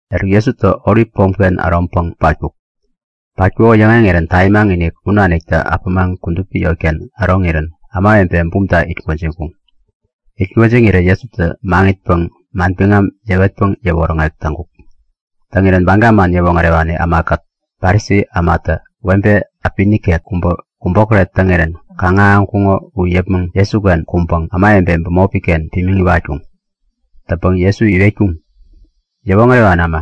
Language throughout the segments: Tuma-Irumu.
Eruk Jesutä Olip pomken äroŋpäŋ u patkuk. Patkuko yäŋeŋirän tamimaŋ-inik u naniktä äpämaŋ kudupi yotken äroŋirän ämawebe bumta it gwäjiŋkuŋ. Itgwäjiŋirä Jesutä maŋitpäŋ manbiŋam yäwetpäŋ yäwoŋärek täŋkuk. Täŋirän Baga man yäwoŋärewani ämakät Parisi ämatä webe äpi nikek kubä kubokäret täŋirän kaŋ-ahäŋkuŋo u yäpmäŋ Jesuken kuŋpäŋ ämawebe bämopi-ken pimiŋ iwatkuŋ. Täŋpäŋ Jesu iwetkuŋ; Yäwoŋärewani äma,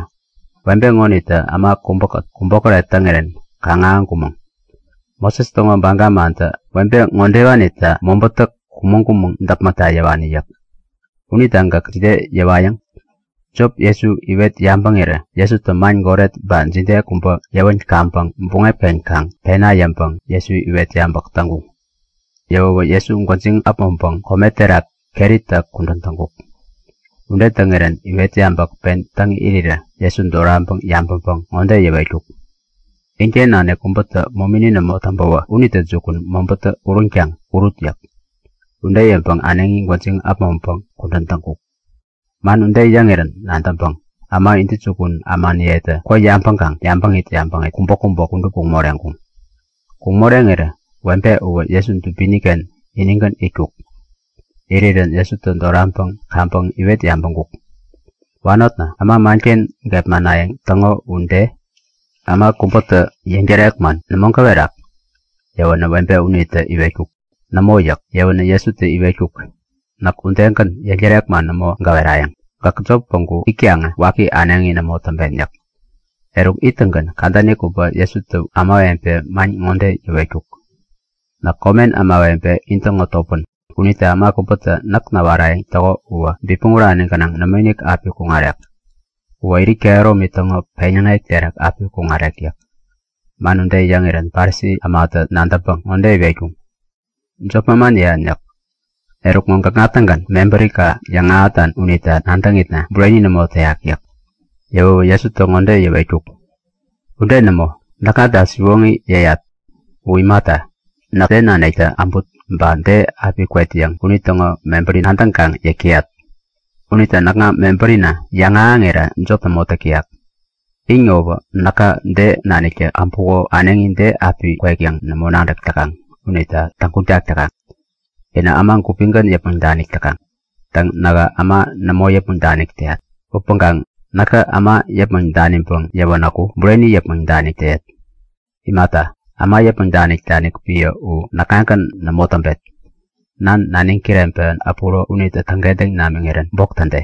webe ŋonitä äma kubäkät kubokäret täŋirän kaŋ-ahäŋkumäŋ. Moses täŋo baga mantä webe ŋodewanita mobätä kumäŋ-kumäŋ däpmäkta yäwani yäk. Unita gäkä jide yäwayäŋ? Jop Jesu iwet yabäŋirä Jesutä man goret ba jide kubä yäwän kaŋpäŋ buŋep-ken kaŋ pena yäŋpäŋ Jesu iwet yabäk täŋkuŋ. Yäwäwä Jesu gwäjiŋ äpmoŋpäŋ kome terak keritä kudän täŋkuk. Ude täŋirän iwet yabäk pen täŋ irirä Jesu doraŋpäŋ yabäŋpäŋ ŋode yäwetkuk; Inken nanik kubätä momini nämo täŋpäwä unitä jukun mobätä uränkaŋ urut yäk. Ude yäŋpäŋ äneŋi gwäjiŋ äpmoŋpäŋ kudän täŋkuk. Man ude yäŋirän nadäŋpäŋ äma intäjukun ämaniyetä kwä yabäŋkaŋ yabäŋit yabäŋit kubäkubä kudup kuŋ moreŋkuŋ. Kuŋ moreŋirä webe uwä Jesu dubini-ken inigän itkuk. Irirän Jesutä doraŋpäŋ kaŋpäŋ iwet yabäŋkuk; Wanotna, äma manken gepmanayäŋ täŋo u de? Äma kubätä yäŋtärek man nämo gäwerak? Yäwänä webe unitä Nämo yäŋ yäwänä Jesutä iwetkuk; Näk udegän, yäŋtärek man nämo gäwerayäŋ. Gäk jop päŋku itkaŋä waki äneŋi nämo täŋpen yäk. Eruk ittäŋgän kadäni kubä Jesutä ämawebe man ŋode yäwetkuk; Näk komen ämawebe intäŋo topän. Unita äma kubätä näk näwarayäŋ täko uwä bipmäŋ urani gänaŋ nämoinik api kuŋarek. Uwä irit kehäromi täŋo peŋyäŋek terak api kuŋarek yäk. Man ude yäŋirän Parisi ämatä nadäŋpäŋ ŋode iwetkuŋ; Jop manman yäyan yäk. Eruk ŋo gäkŋa-tägän mebärika yäŋahätan unita nadäŋitna bureni nämo täyak yäk. Yäwäwä Jesutä ŋode yäwetkuk; Ude nämo. Näkŋata siwoŋi yäyat. U imata, näk de naniktä äbut ba de api kwet yäŋ unitäŋo mebäri nadäŋkaŋ yäk täyat. Unita näkŋa mebärina yäŋahäŋira jopi nämo täk täyak. In ŋowä näka de naniktä äbuko äneŋi de api kwek yäŋ nämo nadäk täkaŋ unita täŋguŋtak täkaŋ. Inä äma gupigän yäpmäŋ danik täkaŋ. Täŋ, nähä äma nämo yäpmäŋ danik täyat. Upäŋkaŋ näkä äma yäpmäŋ daniŋpäŋ yäwänäku bureni yäpmäŋ danik täyet. Imata, äma yäpmäŋ danik-danik epän u näkŋagän nämo täŋpet. Nan naniŋ kireŋpewän äpuro unitä täŋkentäŋ namiŋirän bok täde.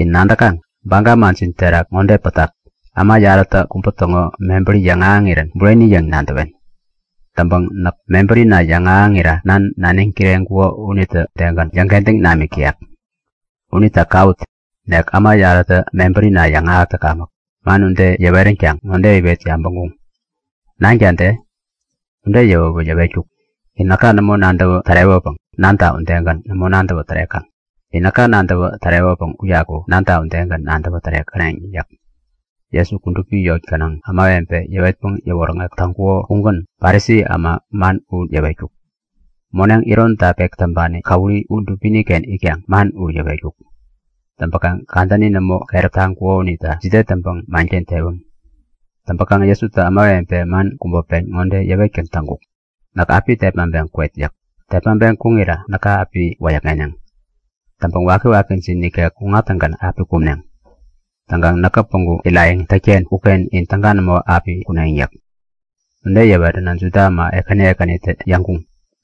In nadäkaŋ? Baga manjin terak ŋode pätak; Äma yarätä kubä täŋo mebäri yäŋahäŋirän bureni yäŋ nadäwen. Täŋpäŋ näk mebärina yäŋahäŋira Nan, naniŋ kireŋkuko unitä udegän yäŋkentäŋ namik täyak. U kawut, nek äma yarätä mebärina yäŋahäk täkamäk! Man ude yäweränkaŋ ŋode iwet yabäŋkuŋ; Nanka de? Ude yäwäwä yäwetkuk; In näka nämo nadäwä tärewäpäŋ nanta udegän nämo nadäwä tärekaŋ. In näka nadäwä tärewäpäŋ uyaku Nanta udegän nadäwä tärekäneŋ yäk. Jesu kudupi eŋi gänaŋ ämawebe yäwetpäŋ yäwoŋärek täŋkuko ugän Parisi äma man u yäwetkuk. Moneŋ ironta pek täŋpani käwuri u dubini-ken itkaŋ man u yäwetkuk. Täŋpäkaŋ kadänini nämo keräp taŋkuko unita jide täŋpäŋ manken tewäm. Täŋpäkaŋ Jesutä ämawebe man kubä pen ŋode yäwetgän täŋkuk; Näk api tepmaŋpeŋ kwet yäk. Tepmaŋpeŋ kuŋira näka api wäyäkŋeneŋ. Täŋpäŋ wakiwakijin nikek kuŋattäŋgän api kumneŋ. Täŋkaŋ näkä päŋku irayäŋ tätken uken in täga nämo api kuneŋ yäk. Ude yäwänä Juda äma ekäni ekänitä yäŋkuŋ;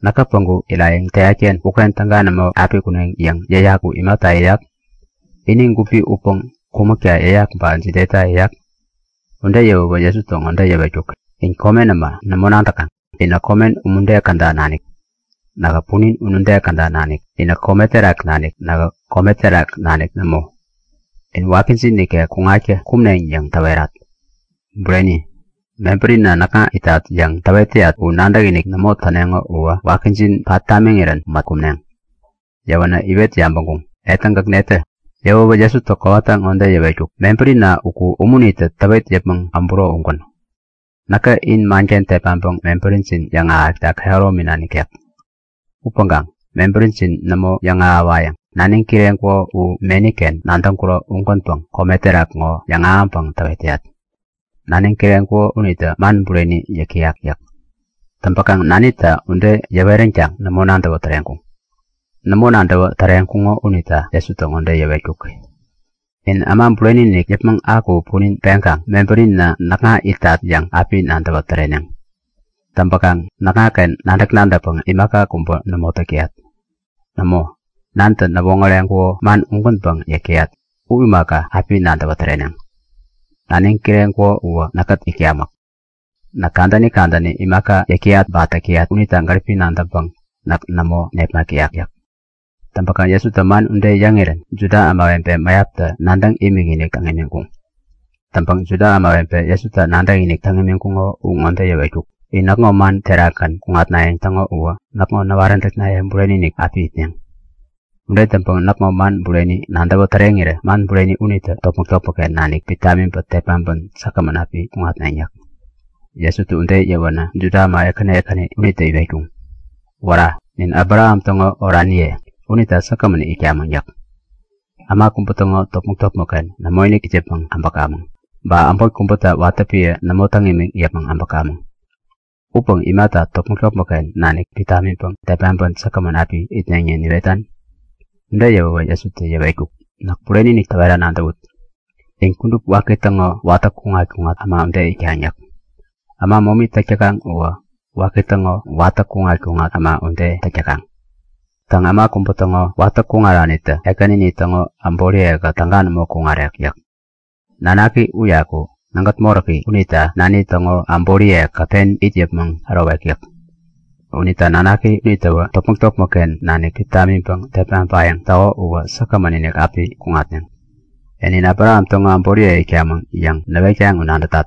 Näkä päŋku irayäŋ täyat-ken uken täga nämo api kuneŋ yäŋ yäyak u imata yäyak? Ini gupi utpäŋ kumäkta yäyak ba jideta yäyak? Ude yäwäwä Jesutä ŋode yäwetkuk; In komen äma nämo nadäkaŋ. Inä komen umude käda nanik. Nähä punin unude käda nanik. Inä kome terak nanik. Nähä kome terak nanik nämo. In wakijin nikek kuŋatkä kumneŋ yäŋ täwerat. Bureni, mebärina näkŋa itat yäŋ täwet täyat u nadäkinik nämo täneŋo uwä wakijin pat tamiŋirän mät kumneŋ. Yäwänä iwet yabäŋkuŋ; E täŋ, gäk netä? Yäwäwä Jesutä kowata ŋode yäwetkuk; Mebärina uku, umunitä täwet yäpmäŋ äbäro ugän. Näkä in manken tepmaŋpäŋ mebärijin yäŋahäkta kehäromina nikek. Upäŋkaŋ mebärijin nämo yäŋahäwayäŋ. Naniŋ kireŋkuko u meni-ken nadäŋkuro ugänpäŋ kome terak ŋo yäŋahäŋpäŋ täwet täyat. Naniŋ kireŋkuko unitä man bureni yäk täyak yäk. Täŋpäkaŋ Nanita ude yäweränkaŋ nämo nadäwä täreŋkuŋ. Nämo nadäwä täreŋkuŋo unita Jesutä ŋode yäwetkuk; In Äma Bureni-inik yäpmäŋ aku punin peŋkaŋ mebärina näkŋa itat yäŋ api nadäwä täreneŋ. Täŋpäkaŋ näkŋaken nadäk-nadäkpäŋ imaka kubä nämo täk täyak. Nämo, Nantä näwoŋäreŋkuko man ugänpäŋ yäk täyat. U imaka, api nadäwä täreneŋ. Naniŋ kireŋkuko uwä näkkät itkamäk. Näk kadäni kadäni imaka yäk täyat ba täk täyat unita gäripi nadäŋpäŋ näk nämo nepmak täyak yäk. Täŋpäkaŋ Jesutä man ude yäŋirän Juda ämawebe mäyaptä nadäŋ imikinik täŋ imiŋkuŋ. Täŋpäŋ Juda ämawebe Jesuta nadäkinik täŋ imiŋkuŋo u ŋode yäwetkuk; In näkŋo man terakgän kuŋatnayäŋ täŋo uwä näkŋo näwaräntäknaye bureni-inik api itneŋ. Ude täŋpäŋ näkŋo man bureni nadäwä täreŋirä man bureni unitä topmäk-topmäkken nanik pit tamiŋpäŋ tepmaŋpän säkgämän api kuŋatneŋ yäk. Jesutä ude yäweränä Juda äma ekäni ekäni unitä iwetkuŋ; Wära! Nin Abraham täŋo oraniye unita säkgämän itkamäŋ yäk. Äma kubä täŋo topmäk-topmäkken nämoinik it yäpmäŋ äbäkamäŋ. Ba äbot kubäta watä epän nämo täŋ imiŋ yäpmäŋ äbäkamäŋ. Upäŋ imata topmäk-topmäkken nanik pit tamiŋpäŋ tepmaŋpän säkgämän api itneŋ yäŋ niwetan? Ude yäwäwä Jesutä yäwetkuk; Näk bureni-inik täwera nadäwut; In kudup waki täŋo watä kuŋat-kuŋat äma ude itkaŋ yäk. Äma momi täk täkaŋ uwä waki täŋo watä kuŋat-kuŋat äma ude täk täkaŋ. Täŋ äma kubä täŋo watä kuŋaranitä ekänini täŋo äboriye-kät täga nämo kuŋarek yäk. Nanaki uyaku nägät moräki unita nani täŋo äboriyekät pen it yäpmäŋ ärowek yäk. Unita Nanaki unitäwä topmäk-topmäkken nanik pit tamiŋpäŋ tepmaŋpayäŋ täko uwä säkgämän-inik api kuŋatneŋ. E, nin Abraham täŋo äboriye itkamäŋ yäŋ näwetkaŋ u nadätat.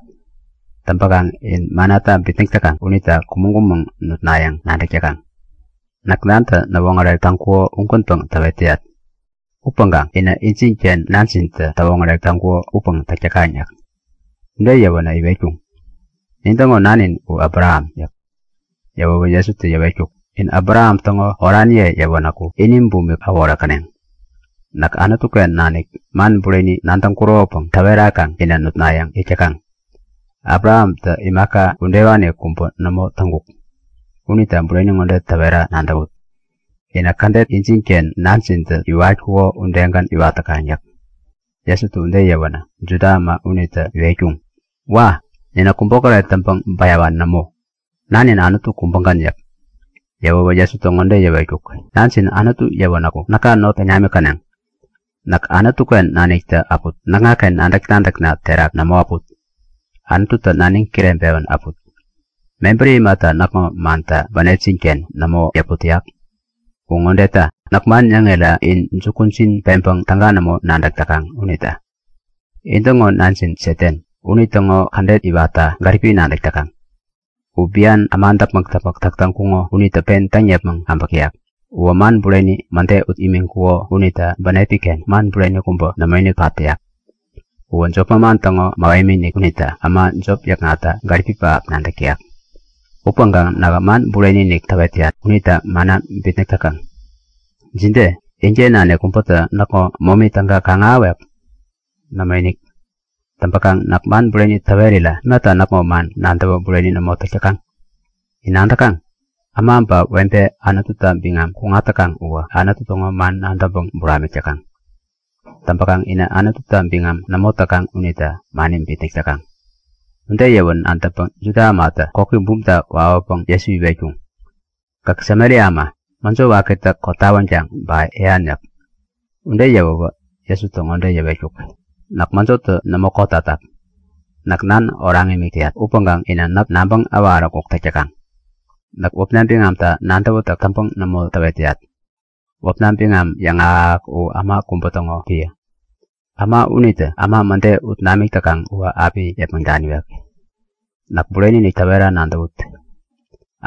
Täŋpäkaŋ in mannata bitnäk täkaŋ unita kumäŋ-kumäŋ nutnayäŋ nadäk täkaŋ. Näk Nantä näwoŋärek täŋkuko ugänpäŋ täwet täyat. Upäŋkaŋ inä injinken nanjintä täwoŋärek täŋkuko upäŋ täk täkaŋ yäk. Ude yäwänä iwetkuŋ; Nin täŋo nanin u Abraham! yäk. Yäwäwä Jesutä yäwetkuk; In Abraham täŋo oraniye yäwänäku ini bumik äworekäneŋ. Näk Anutu-ken nanik man bureni nadäŋkuropäŋ täwerakaŋ inä nutnayäŋ yäk täkaŋ. Abrahamtä imaka udewani kubä nämo täŋkuk. Unita bureni ŋode täwera nadäwut; Inä kädet injinken nanjintä iwatkuko udegän iwat täkaŋ yäk. Jesutä ude yäwänä Juda äma unitä iwetkuŋ; Wa! Ninä kubokäret täŋpäŋ bäyawani nämo! Nanin Anutu kubägän yäk. Yäwäwä Jesutä ŋode yäwetkuk; Nanjin Anutu yäwänäku näka not täŋ namikäneŋ. Näk Anutu-ken naniktä äput, näkŋaken nadäk-nadäkna terak nämo äput. Anututä naniŋ kireŋpewän äput. Mebäri imata näkŋo mantä bänepjin-ken nämo yäput täyak? U ŋodeta; Näk man yäŋira in jukujin peŋpäŋ täga nämo nadäk täkaŋ unita. In-täŋo nanjin Satan. Unitäŋo kädet iwatta gäripi nadäk täkaŋ. U bian äma däpmäk-däpmäk täk täŋkuko unitä pen täŋ yäpmäŋ äbäk täyak. Uwä man bureni mäde ut imiŋkuko unita bänepi-ken man bureni kubä nämoinik pat täyak. Uwä jop manman täŋo mähemi-inik unita äma jop yäkŋatta gäripi pähap nadäk täyak. Upäŋkaŋ nähä man bureni-inik täwet täyat unita manna bitnäk täkaŋ. Jide? Inken nanik kubätä näkŋo momi täga kaŋ-ahäwek? Nämoinik. Täŋpäkaŋ näk man bureni täwerira imata näkŋo man nadäwä bureni nämo täk täkaŋ? In nadäkaŋ? Äma ba webe Anututa biŋam kuŋat täkaŋ uwä Anutu täŋo man nadäŋpäŋ buramik täkaŋ. Täŋpäkaŋ inä Anututa biŋam nämo täkaŋ unita mani bitnäk täkaŋ. Ude yäwän nadäŋpäŋ Juda ämatä koki bumta wawäpäŋ Jesu iwetkuŋ; Gäk Samaria äma! Mäjo wakitä kotawänkaŋ ba yäyan! yäk. Ude yäwäwä Jesutä ŋode yäwetkuk; Näk mäjotä nämo kotatak. Näk Nan oraŋ imik täyat upäŋkaŋ inä näk nabäŋ äwaräkuk täk täkaŋ. Näk wäpna biŋamta nadäwätäk täŋpäŋ nämo täwet täyat. Wäpna biŋam yäŋahäk-ahäk u Äma kubä täŋo epän. Äma unitä äma mäde ut namik täkaŋ uwä api yäpmäŋ daniwek. Näk bureni-inik täwera nadäwut;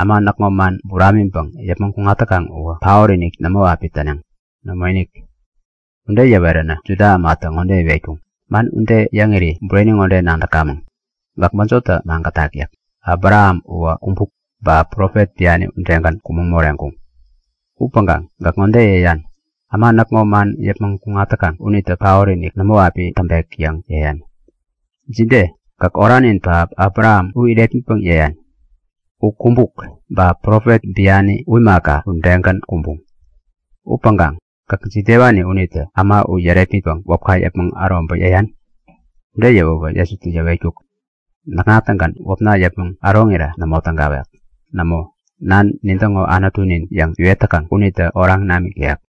Äma näkŋo man buramiŋpäŋ yäpmäŋ kuŋat täkaŋ uwä paot-inik nämo api täneŋ. Nämoinik! Ude yäwänä Juda ämatä ŋode iwetkuŋ; Man ude yäŋiri bureni ŋode nadäkamäŋ; Gäk mäjotä magätak! yäk. Abraham uwä kumbuk, ba profet biani udegän kumäŋ moreŋkuŋ. Upäŋkaŋ gäk ŋode yäyan; Äma näkŋo man yäpmäŋ kuŋat täkaŋ unitä paot-inik nämo api täŋpek yäŋ yäyan! Jide? Gäk oranin pähap Abraham u irepmitpäŋ yäyan? U kumbuk, ba profet biani u imaka udegän kumbuŋ. Upäŋkaŋ gäk jidewani unitä äma u yärepmitpäŋ wäpka yäpmäŋ äroŋpäŋ yäyan? Ude yäwäwä Jesutä yäwetkuk; Näkŋa-tägän wäpna yäpmäŋ äroŋira nämo tägawek. Nämo, Nan, nintäŋo Anutunin yäŋ iwet täkaŋ unitä oraŋ namik täyak.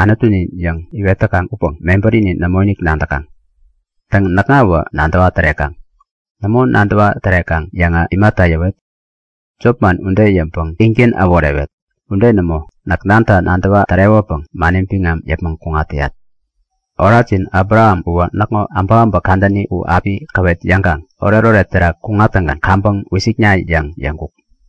Anutunin yäŋ iwet täkaŋ upäŋ mebärini nämoinik nadäkaŋ. Täŋ, näkŋawä nadäwa tärekaŋ. Nämo nadäwa tärekaŋ yäŋä, imata yäwet? Jop man ude yäŋpäŋ ingän äworewet. Ude nämo! Näk Nanta nadäwa tärewäpäŋ mani biŋam yäpmäŋ kuŋat täyat. Orajin Abraham uwä näkŋo äbäkäbäk kadäni u api käwet yäŋkaŋ oretoret terak kuŋattäŋgän kaŋpäŋ wisikinikna! yäŋ yäŋkuk.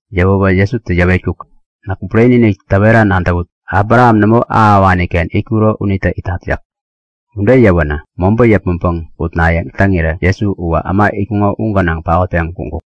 Yäwäwä Jesutä yäwetkuk; Näk bureni-inik täwera nadäwut; Abraham nämo ahäwani-ken itkuro unitä itat yäk. Ude yäwänä mobä yäpmäŋpäŋ utnayäŋ täŋirä Jesu uwä äma itkuŋo u gänaŋ paotpeŋ kuŋkuk.